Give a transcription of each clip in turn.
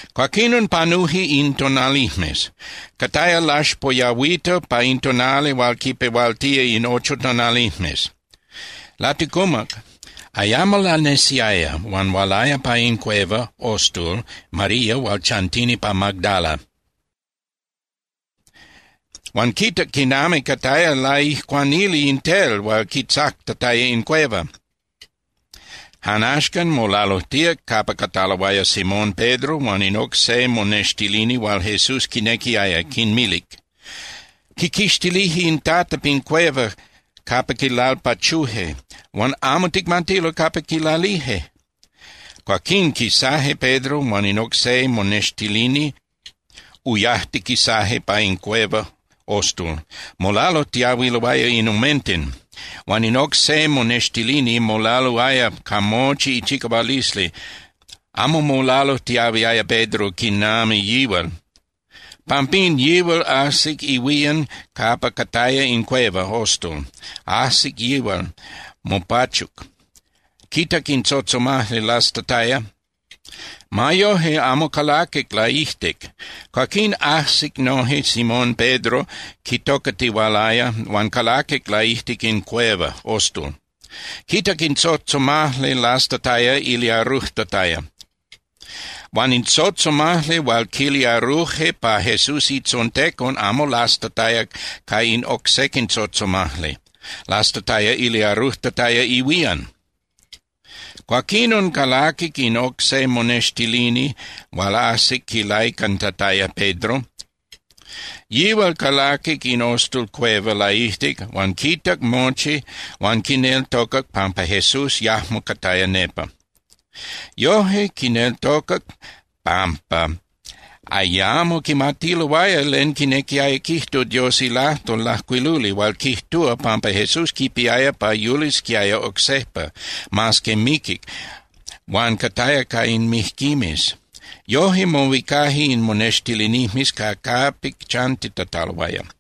Cuaquinon, panuje in tonalijmes. Cataya laxpoyahuita pa in tonali hual quipehualtía in ocho tonalijmes. Laticumac, ayamo lanesiaya, huan hualaya pa in cueva (ostul) María hual chantini pa Magdala, huan quitac quinami cataya laijcuanili in tel hual quitzactataya in cueva. Jan axcan molalujtíac capa cataloaya Simón Pedro huan in oc se monextilini hual Jesús quinequiaya, quinmilic: —Quiquixtilije in Tata pin cueva capa quilalpachuje, huan amo ticmatilo capa quilalije. Cuaquín quisaje Pedro huan in oc se monextilini, uyajtiquisaje pa in cueva (ostul). Molalujtiahuiloaya in omenten, huan in oc se monextilini molaluaya ca mochi ichicahualisli. Amo molalujtiahuiaya Pedro quinami yihual. Pampín, yihual ajsic ihuían capa cataya in cueva (ostul). Ajsic yihual, mopachuc, quitac in tzotzomajli lastataya, ma yoje amo calaquic laijtic. Cuaquín ajsic noje Simón Pedro quitocatihualaya huan calaquic laijtic in cueva (ostul). Quitac in tzotzomajli lastataya iliarujtataya. Huan in tzotzomajli hual quiliaruje pa Jesús itzontecon amo lastataya ca in oc sequin tzotzomajli, lastataya iliarujtataya ihuían. Cuaquinon, calaquic in oc se monextilini hual ajsic quilaicantataya Pedro. Yihual calaquic in ostul (cueva) laijtic huan quitac mochi huan quineltocac pampa Jesús yajmo cataya nepa. Yoje quineltocac pampa ayamo quimatiloaya len quinequiaya quijtu Dios ilajtol lajcuiluli hual quijtúa pampa Jesús quipiaya pa yulisquiaya oc sejpa mas que miquic huan cataya ca in mijquimes. Yoje, mohuicaje in monextilinijmes ca capic chantitataloaya.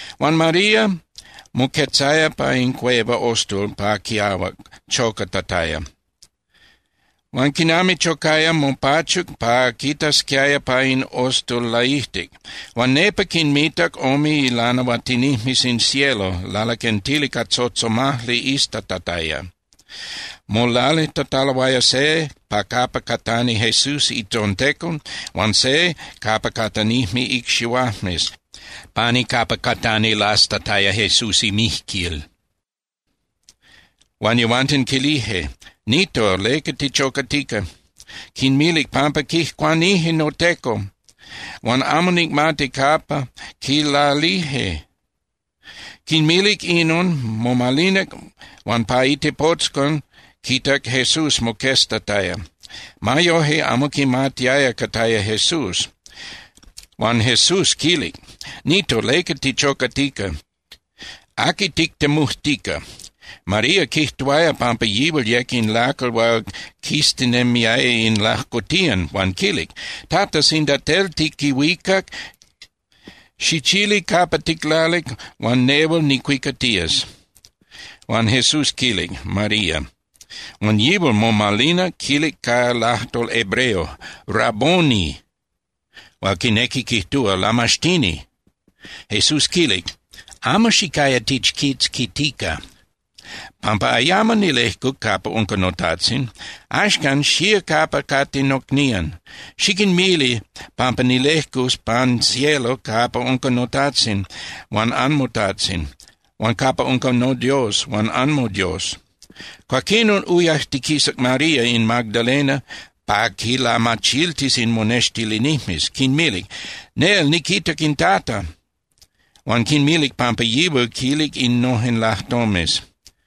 Huan María moquetzaya pa in cueva (ostul) pa quiahuac, chocatataya. Huan quinami chocaya, mopachuc pa quitasquiaya pa in ostul laijtic. Huan nepa quinmitac ome ilanahuatinijmes in cielo lalaquentili ca tzotzomajli iztatataya, molalijtataloaya se pa capa catani Jesús itzontecon huan se capa catanijme icxihuajmes, pani capa catani lastataya Jesús imijquil. Huan yehuanten quilije: —Nito, ¿leca tichocatica? Quinmilic: —Pampa quijcuanije noTeco huan amo nicmati capa quilalije. Quinmilic inon, momalinac huan pa itepotzcon quitac Jesús moqueztataya. Ma yoje, amo quimatiaya cataya Jesús. Huan Jesús quilic: —Nito, ¿leca tichocatica? ¿Aqui tictemujtica? María quijtuaya pampa yihual yec in lacal hual quiztinemiaya in lajcotiyan, huan quilic: —Tata, sinda tel tiquihuicac, xichili capa ticlalic huan nehual nicuicatías. Huan Jesús quilic: —María. Huan yihual momalinac, quilic ca lajtol hebreo: —¡Rabboni! —hual quinequi quijtúa ¡Lamaxtini! Jesús quilic: —Amo xicaya tichquitzquitica, pampa ayamo nilejcuc capa unca noTajtzin. Axcan, xía capa cate nocnían, xiquinmili pampa nilejcus pan cielo capa unca noTajtzin huan anmoTajtzin huan capa unca noDios huan anmoDios. Cuaquinon uyajtiquisac María in magdalena pa quinlamachiltis in monextilinijmes, quinmilic: —¡Nel niquitac in Tata! —huan quinmilic pampa yihual quilic innojen lajtomes.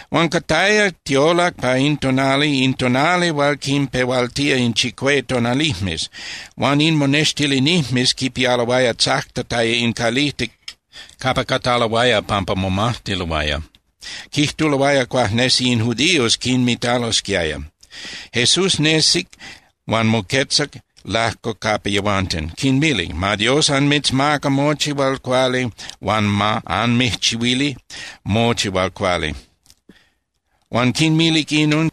Huan cataya tiolac pa in tonali, in tonali hual quinpehualtía in chicue tonalijmes, huan in monextilinijmes quipialoaya tzactataya in calijtic capa cataloaya pampa momajtiloaya. Quijtuloaya cuajnesi in judíos quinmitalosquiaya. Jesús nesic huan moquetzac lajco capa yehuanten, quinmilic: —Ma Dios anmitzmaca mochi hual cuali huan ma anmijchihuili mochi hual cuali. Huan quinmilic inon,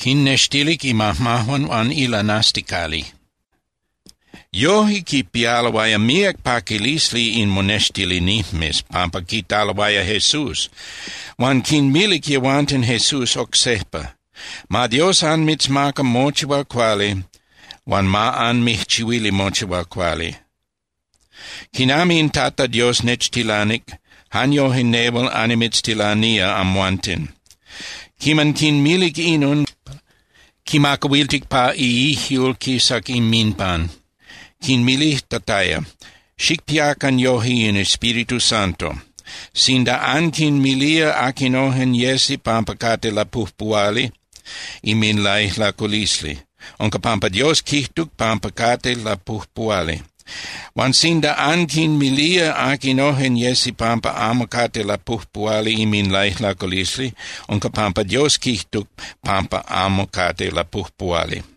quinnextilic imajmajuan huan ilanasticali. Yoje quipialoaya míac paquilisli in monextilinijmes pampa quitaloaya Jesús. Huan quinmilic yehuanten Jesús oc sejpa: —Ma Dios anmitzmaca mochi hual cuali huan ma anmijchihuili mochi hual cuali. Quinami in Tata Dios nechtilanic, jan yoje nehual annimitztilanía amhuanten. Quiman quinmilic inon, quimacahuiltic pa iijyul quisac inminpan, quinmilijtataya: —Xicpiacan yoje in Espíritu Santo. Sinda anquinmilía aquinojen yesi pampa cate lapujpuhuali inminlaijlaculisli, unca pampa Dios quijtuc pampa cate lapujpuhuali. Huan sinda anquinmilía aquinojen yesi pampa amo cate lapujpuhuali inminlaijlaculisli, unca pampa Dios quijtuc pampa amo cate lapujpuhuali.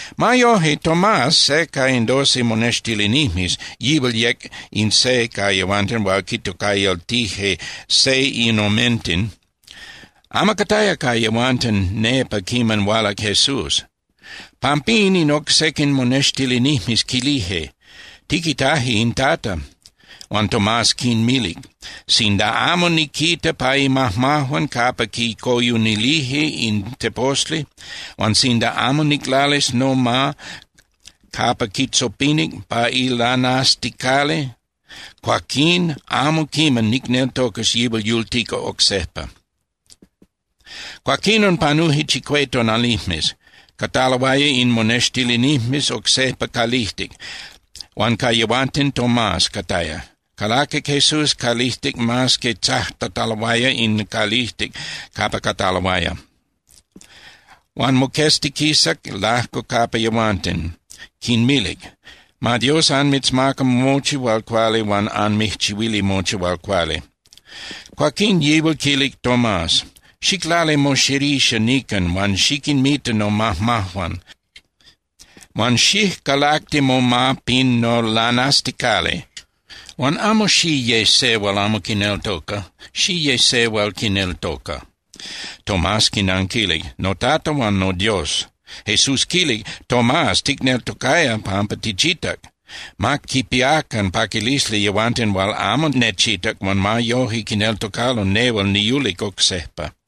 Ma yoje, Tomás, se ca in doce monextilinijmes (yihual yec in se ca yehuanten hual quintocayaltije “Seinomenten”), amo cataya ca yehuanten nepa quiman hualac Jesús. Pampín, in oc sequin monextilinijmes quilije: —Tiquitaje in Tata. Huan Tomás quinmilic: —Sinda amo niquita pa imajmajuan capa quicoyunilije in teposli huan sinda amo niclalis noma capa quitzopinic pa ilanasticali, cuaquín amo quiman nicneltocas yihual yultica oc sejpa. Cuaquinon panuje chicue tonalijmes. Cataloaya in monextilinijmes oc sejpa calijtic, huan ca yehuanten Tomás cataya. Calaquic Jesús calijtic mas que tzactataloaya in calijtic capa cataloaya, huan moqueztiquisac lajco capa yehuanten, quinmilic: —Ma Dios anmitzmaca mochi hual cuali huan anmijchihuili mochi hual cuali. Cuaquín yihual quilic Tomás: —Xiclali moxerixa nican huan xiquinmita nomajmajuan, huan xijcalacti moma pin nolanasticali. Huan amo xiye se hual amo quineltoca, xiye se hual quineltoca. Tomás quinanquilic: —¡NoTata huan noDios! Jesús quilic: —Tomás, ticneltocaya pampa tichitac. Ma quipiacan paquilisli yehuanten hual amo nechitac huan ma yoje quineltocalo nehual niyulic oc sejpa.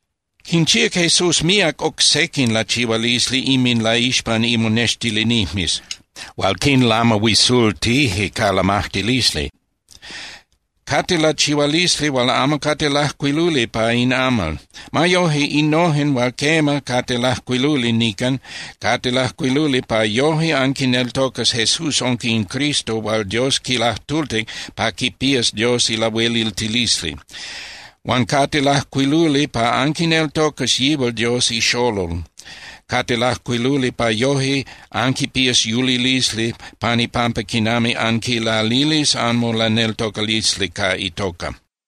Quinchíac Jesús míac oc sequin lachihualisli inminlaixpan imonextilinijmes hual quinlamahuisultije ca lamajtilisli. Cate lachihualisli hual amo cate lajcuiluli pa in amal. Ma yoje, innojen hual quema, cate lajcuiluli nican, cate lajcuiluli pa yoje anquineltocas Jesús unca in Cristo hual Dios quilajtultic pa quipías Dios ilahueliltilisli. Huan cate lajcuiluli pa anquineltocas yihual Dios iXolol, cate lajcuiluli pa yoje anquipías yulilisli pan ipampa quinami anquilalilis anmolaneltocalisli ca itoca.